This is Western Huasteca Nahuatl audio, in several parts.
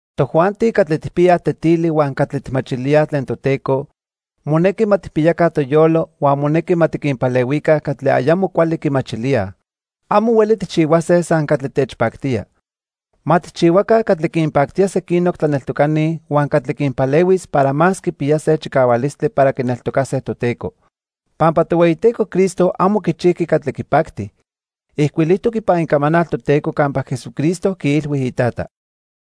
Tojuanti catli tijpiyaj tetili huan cuali tijmachilíaj tlen Toteco, monequi ma tijpiyaca toyolo huan monequi ma tiquinpalehuica catli ayamo cuali quimachilíaj. Amo hueli tijchihuase san catli techpactía. Ma tijchihuaca catli quinpactía sequinoc tlaneltocani huan catli quinpalehuis para más quipiyase chicahualistli para quineltocase Toteco. Pampa Tohueyiteco Cristo amo quichijqui catli quipacti. Ijcuilijtoc ipan Icamanal Toteco campa Jesucristo quiilhui Itata: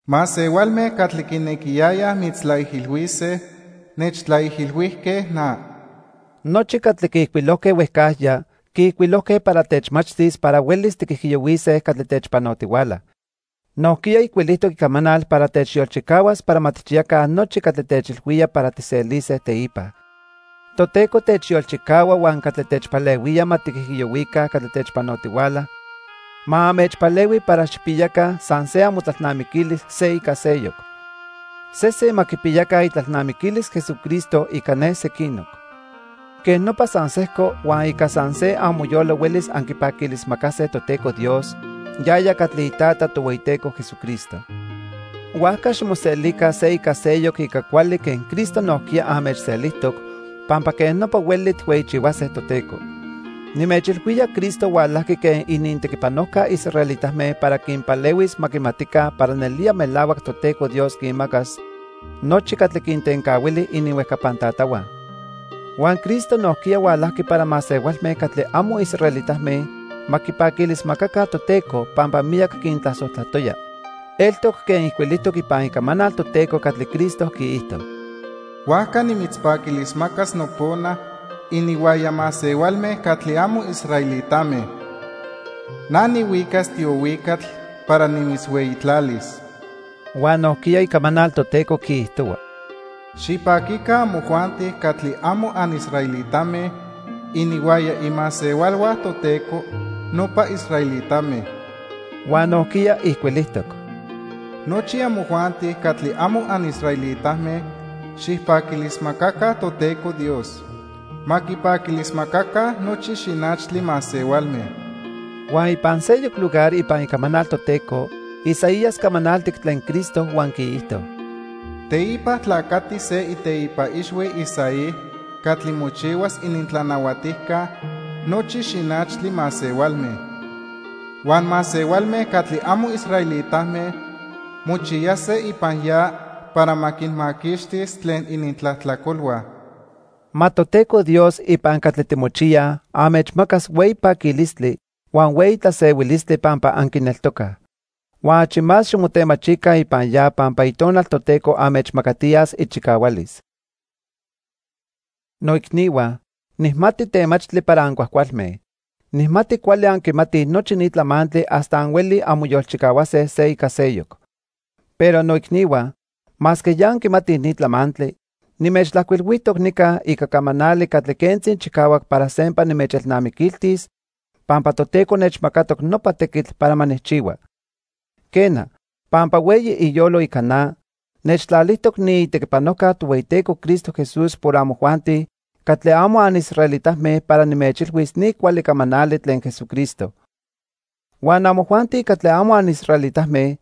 "Masehualme catli quinequiyayaj mitztlaijilhuise, nechtlaijilhuijque na." Nochi catli quiijcuilojque huejcajya, quiijcuilojque para techmachtis para huelis tiquijiyohuise catli techpanotihuala. Nojquiya ijcuilijtoc Icamanal para techyolchicahuas para ma tijchiyaca nochi catli techilhuía para tijselise teipa. Toteco techyolchicahua huan catli techpalehuía ma tiquijiyohuica catli techpanotihuala, ma anmechpalehui para xijpiyaca san se amotlalnamiquilis se ica seyoc. Sesen ma quipiyaca itlalnamiquilis Jesucristo ica ne sequinoc. Quej nopa san sejco huan ica san se amoyolo huelis anquipaquilismacase Toteco Dios, yaya catli iTata Tohueyiteco Jesucristo. Huajca ximoselica se ica seyoc ica cuali quen Cristo nojquiya anmechselijtoc, pampa quej nopa hueli tijhueyichihuase Toteco. Nimechilhuía Cristo hualajqui quen inintequipanojca israelitame para quinpalehuis ma quimatica para nelía melahuac Toteco Dios quinmacas nochi catli quintencahuili ininhuejcapan tatahua. Huan Cristo nojquiya hualajqui para masehualme catli amo israelitame ma quipaquilismacaca Toteco pampa miyac quintlasojtlatoya. Eltoc quen ijcuilijtoc ipan Icamanal Toteco catli Cristo quiijto: "Huajca nimitzpaquilismacas nopona ininhuaya masehualme catli amo israelitame. Na nihuicas tiohuicatl para nimitzhueyitlalis." Huan nojquiya Icamanal Toteco quiijtohua: "Xipaquica amojuanti catli amo anisraelitame ininhuaya imasehualhua Toteco, nopa israelitame." Huan nojquiya ijcuilijtoc: "Nochi amojuanti catli amo anisraelitame xijpaquilismacaca Toteco Dios. Ma quipaquilismacaca nochi xinachtli masehualme." Huan ipan seyoc lugar ipan Icamanal Toteco, Isaías camanaltic tlen Cristo huan quiijto: "Teipa tlacatis se iteipa ixhui Isaí catli mochihuas inintlanahuatijca nochi xinachtli masehualme. Huan masehualme catli amo israelitame mochiyase ipan ya para ma quinmaquixtis tlen inintlajtlacolhua." Ma Toteco Dios ipan catli timochiyaj, anmechmacas hueyi paquilistli, huan hueyi tlasehuilistli pampa anquineltocaj. Huan achi más ximotemachica ipan ya pampa Itonal Toteco anmechmacatiyas ichicahualis. Noicnihua, nijmati temachtli para ancuajcualme. Nijmati cuali anquimatij nochi ni tlamantli hasta anhuelij anmoyolchicahuase se ica seyoc. Pero, noicnihua, masque ya anquimatij ni tlamantli, nimechtlajcuilhuijtoc nica ica camanali catli quentzi chicahuac para sempa nimechelnamiquiltis pampa Toteco nechmacatoc nopa tequitl para ma nijchihua. Quena, pampa hueyi iyolo ica na, nechtlalijtoc niitequipanojca Tohueyiteco Cristo Jesús por amojuanti catli amo anisraelitame para nimechilhuis ni cuali camanali tlen Jesucristo. Huan amojuanti catli amo anisraelitame,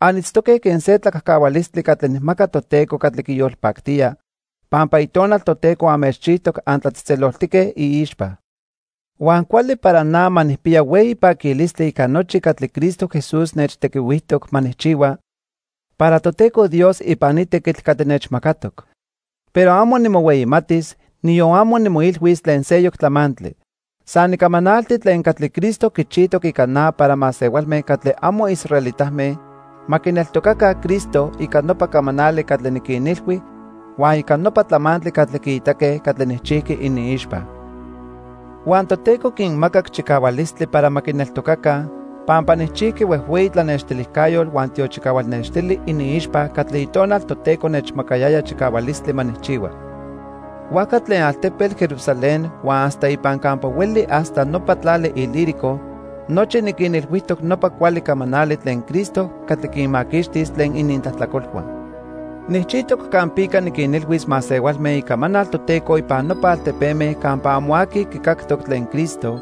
anitztoque quen se tlacajcahualistli catli nijmaca Toteco catli quiyolpactía, pampa Itonal Toteco anmechchijtoc antlatzejtzeloltique iixpa. Huan cuali para na ma nijpiya hueyi paquilistli ica nochi catli Cristo Jesús nechtequihuijtoc ma nijchihua para Toteco Dios ipan ni tequitl catli nechmacatoc. Pero amo nimohueyimatis, niyon amo nimoilhuis tlen seyoc tlamantli. San nicamanalti tlen catli Cristo quichijtoc ica na para masehualme catli amo israelitame ma quineltocaca Cristo ica nopa camanali catli niquinilhui huan ica nopa tlamantli catli quiitaque catli nijchijqui iniixpa. Huan Toteco quinmacac chicahualistli para ma quineltocaca pampa nijchijqui huejhueyi tlanextilijcayotl huan tiochicahual nextili iniixpa catli Itonal Toteco nechmacayaya chicahualistli ma nijchihua. Huajca tlen altepetl Jerusalén huan hasta ipan campa hueli hasta nopa tlali Ilírico nochi niquinilhuijtoc nopa cuali camanali tlen Cristo catli quinmaquixtis tlen inintlajtlacolhua. Nijchijtoc campica niquinilhuis masehualme icamanal Toteco ipan nopa altepeme campa amo aqui quicactoc tlen Cristo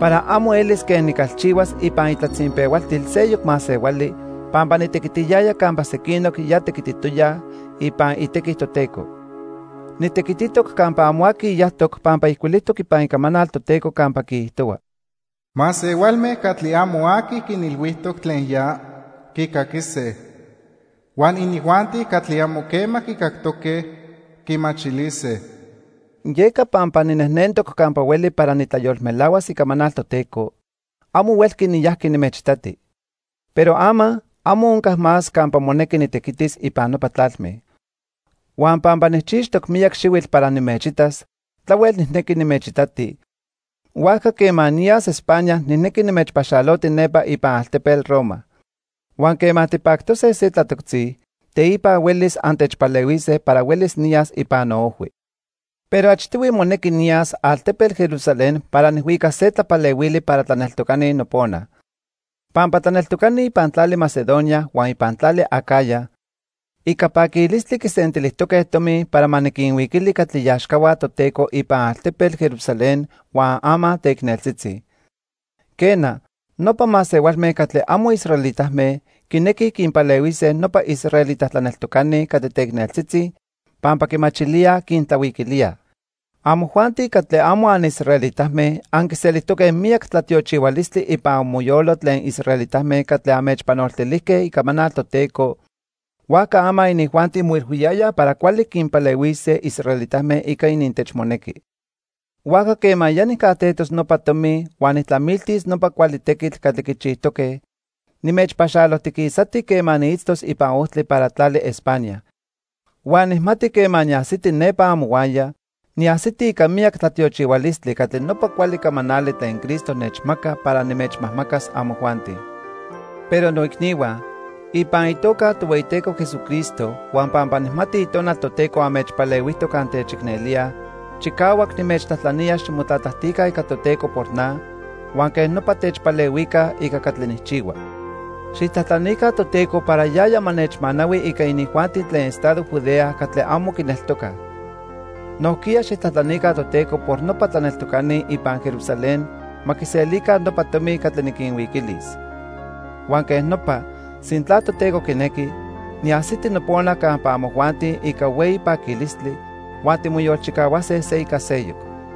para amo elis quen nicalchihuas ipan itlatzinpehualtil seyoc masehuali pampa nitequitiyaya campa sequinoc ya tequititoyaj ipan itequi Toteco. Nitequititoc campa amo aqui yajtoc pampa ijcuilijtoc ipan Icamanal Toteco campa quiijtohua: "Masehualme catli amo aqui quinilhuijtoc tlen ya, quicaquise. Huan inijuanti catli amo quema quicactoque, quimachilise." Yeca pampa ninejnentoc campa hueli para nitlayolmelahuas icamanal Toteco, amo huelqui niyajqui nimechitati. Pero ama, amo onca más campa monequi nitequitis ipan nopa tlalme. Huan pampa nijchixtoc miyac xihuitl para nimechitas, tlahuel nijnequi nimechitati, huajca quema niyas Espa~na, nijnequi nimechpaxaloti nepa ipan altepetl Roma. Huan quema tipactose se tlatoctzi, teipa huelis antechpalehuise para huelis niyas ipan noojhui. Pero achtihui monequi niyas altepetl Jerusalén para nijhuicas se tlapalehuili para tlaneltocani nopona. Pampa tlaneltocani ipan tlali Macedonia huan ipan tlali Acaya ica paquilistli quisentilijtoque tomi para ma niquinhuiquili catli iaxcahua Toteco ipan altepetl Jerusalén huan ama teicneltzitzi. Quena, nopa masehualme catli amo israelitame quinequij quinpalehuise nopa israelita tlaneltocani catli teicneltzitzi pampa quimachilíaj quintlahuiquilíaj. Amojuanti catli amo anisraelitame anquiselijtoque miyac tlatiochihualistli ipan amoyolo tlen israelitame catli anmechpanoltilijque icamanal Toteco, huajca ama inijuanti moilhuiyayaj para cuali quinpalehuise israelitame ica inintechmonequi. Huajca quema ya nijcajtejtos nopa tomi huan nijtlamiltis nopa cuali tequitl catli quichijtoque, nimechpaxalojtiquisati quema niitztoc ipan ojtli para tlali Espa~na. Huan nijmati quema niajsiti nepa amohuaya, niajsiti ica miyac tlatiochihualistli catli nopa cuali camanali tlen Cristo nechmaca para nimechmajmacas amojuanti. Pero noicnihua, ipan itoca Tohueyiteco Jesucristo huan pampa nijmati Itonal Toteco anmechpalehuijtoc antechicnelíaj, chicahuac nimechtlajtlanía ximotlatlajtica ica Toteco por na huan quej nopa techpalehuica ica catli nijchihua. Xijtlajtlanica Toteco para yaya ma nechmanahui ica inijuanti tlen estado Judea catli amo quineltocaj. Nojquiya xijtlajtlanica Toteco por nopa tlaneltocani ipan Jerusalén ma quiselica nopa tomi catli niquinhuiquilis. Huan quej nopa, sintla Toteco quinequi, niajsiti nopona campa amojuanti ica hueyi paquilistli, huan timoyolchicahuase se ica seyoc.